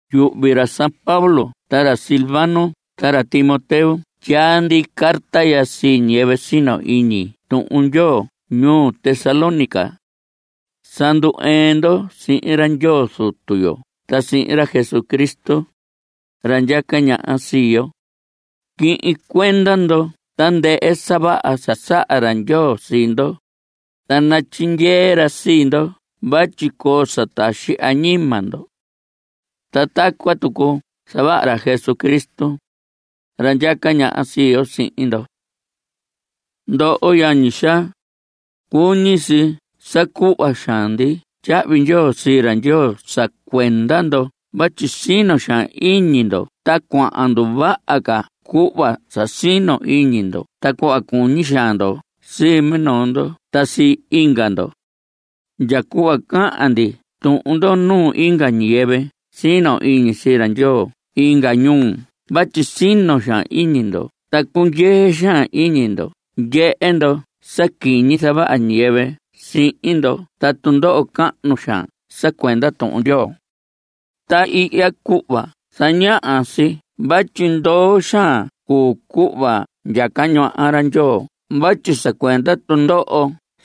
Yuhvi ra Pablo ta ra Silvano ta ra Timoteo tyaa ndi carta ya sii ñiyɨvɨ sino iñi Tuhun Ndyoo ñuu Tesalónica. Sa ndu‑ɨɨn ndo sihin ra Ndyoo Zutu yo ta sihin ra Jesucristo, ra ndyaca ñaha sii yo. Quihin cuenda ndo tandɨhɨ sa vaha saha ra Ndyoo sii ndo, ta natyindyee ra sii ndo vatyi coo sa taxi añima ndo. Ta tacuan tucu nazavaha ra Jesucristo, ra ndyaca ñaha sii yo, sihin ndo. Ndoho yañi xaa, cuñi si sa cuhva xaan ndi tyahvi ndyoo sii ra Ndyoo sa cuenda ndo vatyi sino xaan iñi ndo ta cuahan nduvaha ca cuhva sa sino iñi ndo ta cuhva cuñi xaan ndo sii minoo ndo ta inga ndo. Ndya cuhva cahan ndi tuhun ndo nuu inga ñiyɨvɨ sino iñi sii ra Ndyoo inga ñuu vatyi sino xaan iñi ndo ta cundyee xaan iñi ndo ndyehe ndo sa quiñi zavaha ñiyɨvɨ sihin ndo ta tundoho cahnu xaan sa cuenda Tuhun Ndyoo. Ta ihya cuhva zañaha si vatyi ndoo xaan cuu cuhva ndyaca ñaha ra Ndyoo vatyi sa cuenda tundoho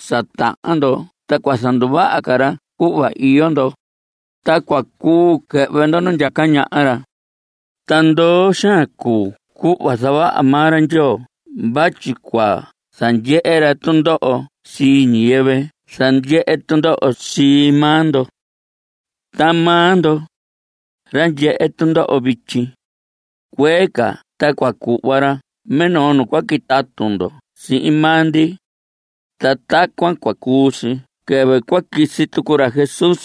sa tahan ndo ta cua zanduvaha ra cuhva iyo ndo, ta cua cuu quɨhvɨ ndo nu ndyaca ñaha ra. Ta ndoo xaan cuu cuhva zavaha maa ra Ndyoo vatyi cua zandyehe ra tundoho sii ñiyɨvɨ zandyehe tundoho sii maa ndo. Ta maa ndo, ra ndyehe tundoho vityi, cuee ca ta cua cuhva ra minoo nu cua quitatu ndo sihin maa ndi. Ta tacuan cua cuu si quɨvɨ cua quisi tucu ra Jesús,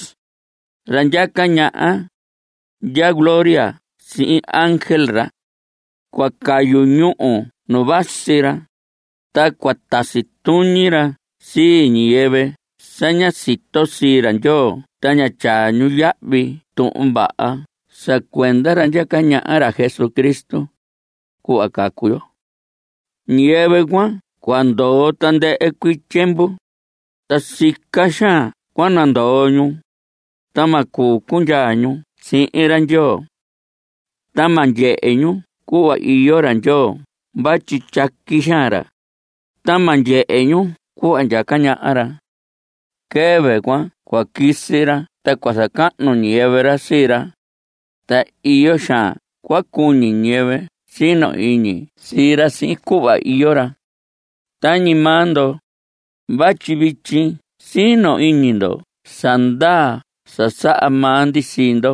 ra ndyaca ñaha, ndya gloria sihin ángel ra. Cua cayu ñúhu nu vasi ra, ta cua tasi tuñi ra sii ñiyɨvɨ sa ña sito sii ra Ndyoo ta ña tyaa ñu yahvi Tuhun Vaha sa cuenda ra ndyaca ñaha, ra Jesucristo, cuhva cacu yo. Ñiyɨvɨ cuan cua ndoho tandɨhɨ cuii tyiemvu, ta sica xaan cua nandoo ñu, ta ma cuu cundyaa ñu sihin ra Ndyoo. Ta ma ndyehe ñu cuhva iyo ra Ndyoo vatyi tyaqui xaan ra, ta ma ndyehe ñu cuhva ndyaca ñaha ra. Quɨvɨ cuan cua quisi ra ta cua zacahnu ñiyɨvɨ ra sii ra, ta iyo xaan cua cuñi ñiyɨvɨ sino iñi sii ra sihin cuhva iyo ra. Tañi maa ndo, vatyi vityi sino iñi ndo sa ndaa sa saha maa ndi sii ndo.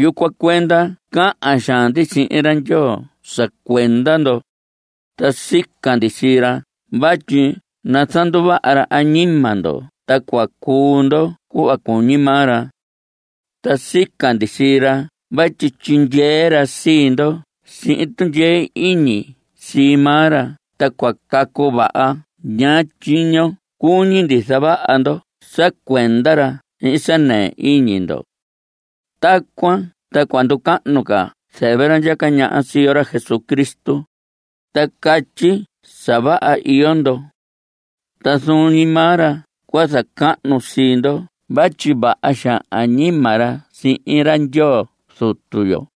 Yucuan cuenda cahan xaan ndi sihin ra Ndyoo sa cuenda ndo, ta sica ndi sii ra vatyi nazanduvaha ra añima ndo ta cua cuu ndo cuhva cuñi maa ra. Ta sica ndi sii ra vatyi tyindyee ra sii ndo sihin tundyee iñi sii maa ra ta cua cacu vaha ñaa tyiño cuñi ndo zavaha ndo sa cuenda ra sihin sa nɨɨ iñi ndo. Tacuan ta cua nducahnu ca zɨvɨ ra ndyaca ñaha sii yo, ra Jesucristo, sa catyi sa vaha iyo ndo. Ta zuun ñi maa ra cua zacahnu sii ndo vatyi vaha xaan añima ra sihin ra Ndyoo Zutu yo.